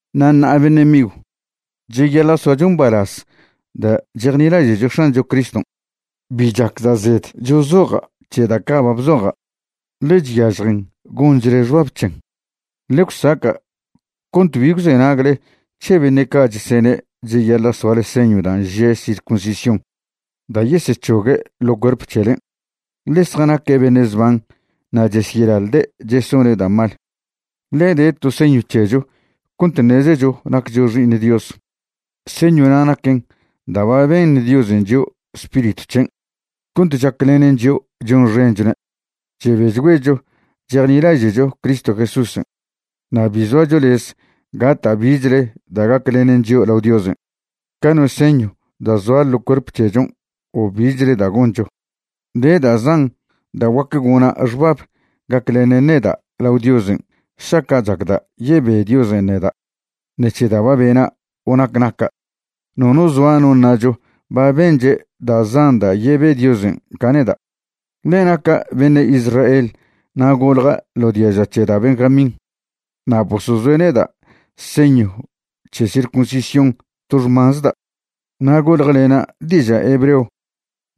Na' ṉa'a beṉe' migw, cheyaḻa' soacho mbalaz da' chejnilaže'cho X̱ancho Criston'. Bi chacda' zed chozoja' c̱he da' ca' ba bzoja', ḻe chyažjen gonchle xbab c̱hen. Ḻe gwsaca' cont bi gwzenagle c̱he beṉe' ca' chesene' cheyaḻa' soale señw dan' že' circuncisión da' yesec̱hogue' ḻo cuerp c̱helen', ḻe zjanaque' beṉe' zban na' chesyeḻaḻde' chesone' da' mal. Ḻe de to señw c̱hecho cont ṉezecho naccho xi'iṉ Dios. Señwna' naquen da' ba beṉ Diosen' chio' Spiritw c̱hen' cont chaclenen chio' chonxenchone'. Chebechgüecho chejnilaže'cho Cristo Jesúsen', na' bi zoacho lez gata' bichle da' gaclenen chio' lao Diosen', ca no señw da' zoa ḻo cuerp c̱hechon' o bichle da' goncho. De da' zan da' guac gona' xbab gaclenen neda' lao Diosen' šaca' chacda' yebe Diosen' neda' ṉec̱he da' ba bena' o nac naca'. Nono zoa no ṉacho ba benche' da' zan da' yebe Diosen' ca neda'. Ḻe naca' beṉe' Israel na' golja' ḻo diaža c̱he da' Benjamín, na' bosozoe' neda' señw c̱he circuncisión to xmanzda'. Na' goljlena' diža' hebreo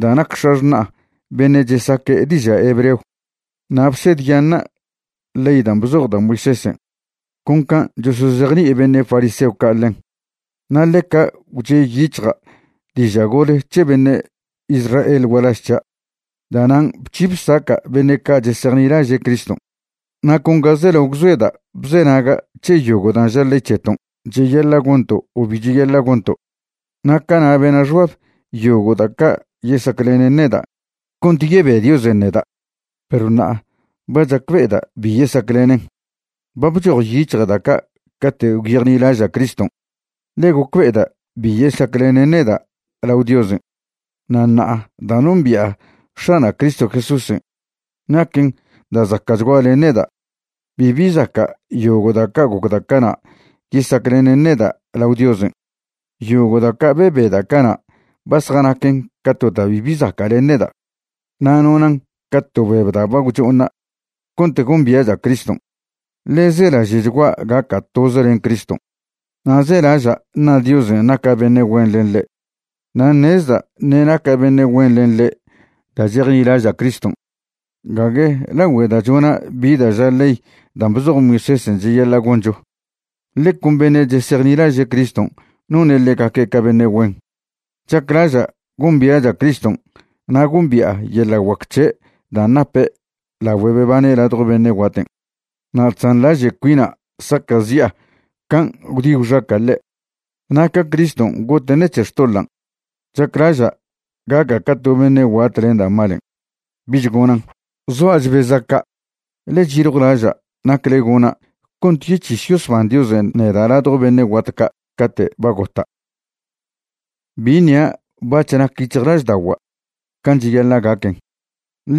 da' nac x̱axṉa'a beṉe' chesaque' diža' hebreo. Na' bsedyaṉa' ley dan' bzoj da' Moisésen' con can' chosozejni'i beṉe' fariseo ca' ḻen. Na' ḻeca gwche' yic̱hja' diža' gole c̱he beṉe' Israel gualaž c̱hia'. Da'nan' bc̱hi bsaca' beṉe' ca' chesejnilaže' Criston'. Na' con ga zelao gwzoeda' bzenaga' c̱he yogo' dan' ža ley c̱heton' cheyaḻa' gonto' o bi cheyaḻa' gonto'. Na' cana' bena' xbab yogo' da' ca' yesaclenen neda' cont yebe Diosen' neda', perw ṉa'a ba chacbe'eda' bi yesaclenen. Ba bchojyic̱hja' da' ca' cate' gwyejnilaža' Criston', ḻe gocbe'eda' bi yesaclenen neda' lao Diosen'. Na' ṉa'a da' nombi'a X̱ana' Cristo Jesúsen' naquen da' zaca'chgua len neda'. Bibi zaca' yogo' da' ca' gocda' cana' yesaclenen neda' lao Diosen'. Yogo' da' ca' bebeda' cana' ba zjanaquen ca to da' bibi zaca' len neda', na' nonan' ca to beb da' ba gwcho'oṉa' cont gombia'cha' Criston'. Ḻe zelaže'chgua' gaca' toz len Criston', na' zelaža' ṉa Diosen' naca' beṉe' güen len ḻe'. Na' ṉezda' ṉe' naca' beṉe' güen len ḻe' da' chejnilaža' Criston', gague lagüe da' chona' bi da' ža ley dan' bzoj Moisésen' cheyaḻa' goncho. Ḻe con beṉe' chesejnilaže' Criston' none' ḻegaque' ca beṉe' güen. Chaclaža' gombia'cha' Criston' na' gombi'a yeḻa' guac c̱he' dan' nape' lagüe bebane' ladjo beṉe' guaten', na' chzanḻaže' cuina' saca'zi'a can' gwdi gwxaca' ḻe'. Na' ca Criston' gote' ṉec̱he xtoḻan', chaclaža' gaca' ca to beṉe' guat len da' malen', bich gonan'. Zoa' chbeza' ca', ḻe cheyiljwlaža' nacle gona' cont yec̱his yosban Diosen' neda' ladjo beṉe' guat ca' cate' ba gota'. Bi ṉia' bac̱h nac yic̱hjlažda'ogua' can' cheyaḻa' gaquen,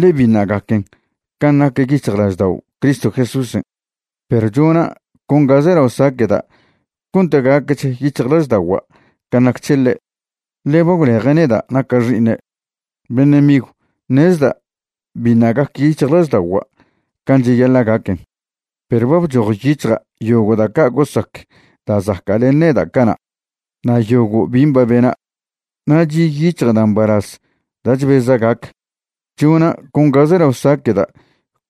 ḻe biṉa' gaquen can' nac yic̱hjlaždao' Cristo Jesúsen'. Perw chona' con ga zelao saqueda' cont gaquech yic̱hjlažda'ogua' can' nac c̱he ḻe', ḻe ba gwleje' neda' naca' xi'iṉe'. Beṉe' migw, ṉezda' biṉa' gac yic̱hjlažda'ogua' can' cheyaḻa' gaquen, perw ba bchojyic̱hja' yogo' da' ca' gosac da' zaca' len neda' cana' na' yogo' bin' ba bena', na' chi' yic̱hja' da' mbalaz da' chbeza' gac. Chona' con ga zelao saqueda'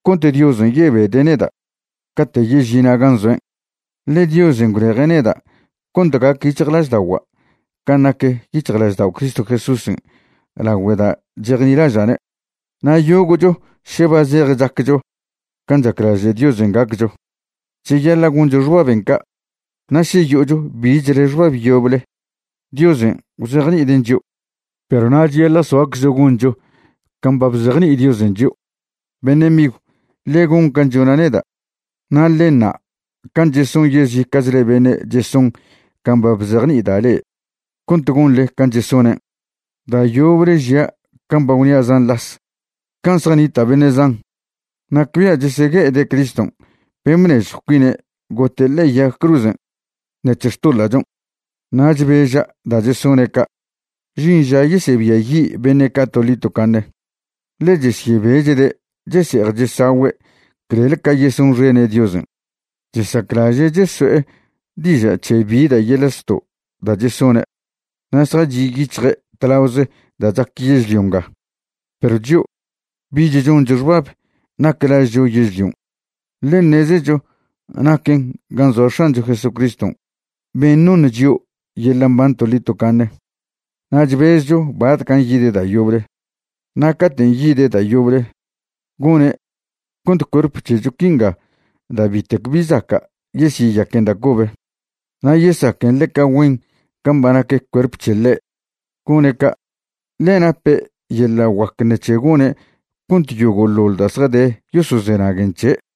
cont Diosen' yebede' neda' cate' yežina' gan' zoen'. Ḻe Diosen' gwleje' neda' cont gac yic̱hjlažda'ogua' can' nac yic̱hjlaždao' Cristo Jesúsen' lagüe da' chejnilaža'ne'. Na' yogo'cho še ba zej chaccho can' chaclaže' Diosen' gaccho, cheyaḻa' goncho xbaben' ca', na' še yo'ocho bichle xbab yoble, Diosen' gwzejni'iden' chio'. Perw na' cheyaḻa' soaczcho goncho can' ba bzejni'i Diosen' chio'. Beṉe' migw, ḻe gon can' chona' neda', na' ḻe ṉa' can' cheson yezica'chle beṉe' cheson can' ba bzejni'ida' le'e, cont gonḻe can' chesonen'. Da' yoble žia' can' ba gwnia' zan las, can' zjanita' beṉe' zan, nacbia' chesegue'ede' Criston' ben' bnežjw cuine' gote' le'e yag cruzen' ṉec̱he xtoḻa'chon'. Na' chbeža' da' chesone' ca'. Žin ža yesebiayi' beṉe' ca' toḻi tocaṉe, ḻe chesyebechde' chese'ej chesagüe' clel ca yesonxene' Diosen'. Chesaclaže' cheso'e diža' c̱he bi da' yeḻa' zto' da' chesone', na' zjachi' yic̱hje' tlaoze da' chac yežlio nga. Perw chio', bich choncho xbab nac lažcho yežlion', ḻe ṉezecho naquen gan' zoa X̱ancho Jesucriston' ben' noṉ chio' yeḻa' mban toḻi tocaṉe, na' chbezcho batcan' yide' da' yoble. Na' caten' yide' da' yoble, gone' cont cuerp c̱hecho quinga da' bitec bi zaca' yesyeyaquen da' cobe, na' yesaquen ḻeca güen can' ba nac cuerp c̱he ḻe'. Gone' ca', ḻe nape' yeḻa' guac ṉec̱he gone' cont yogo'ḻoḻ da' zjade yosozenaguen c̱he'.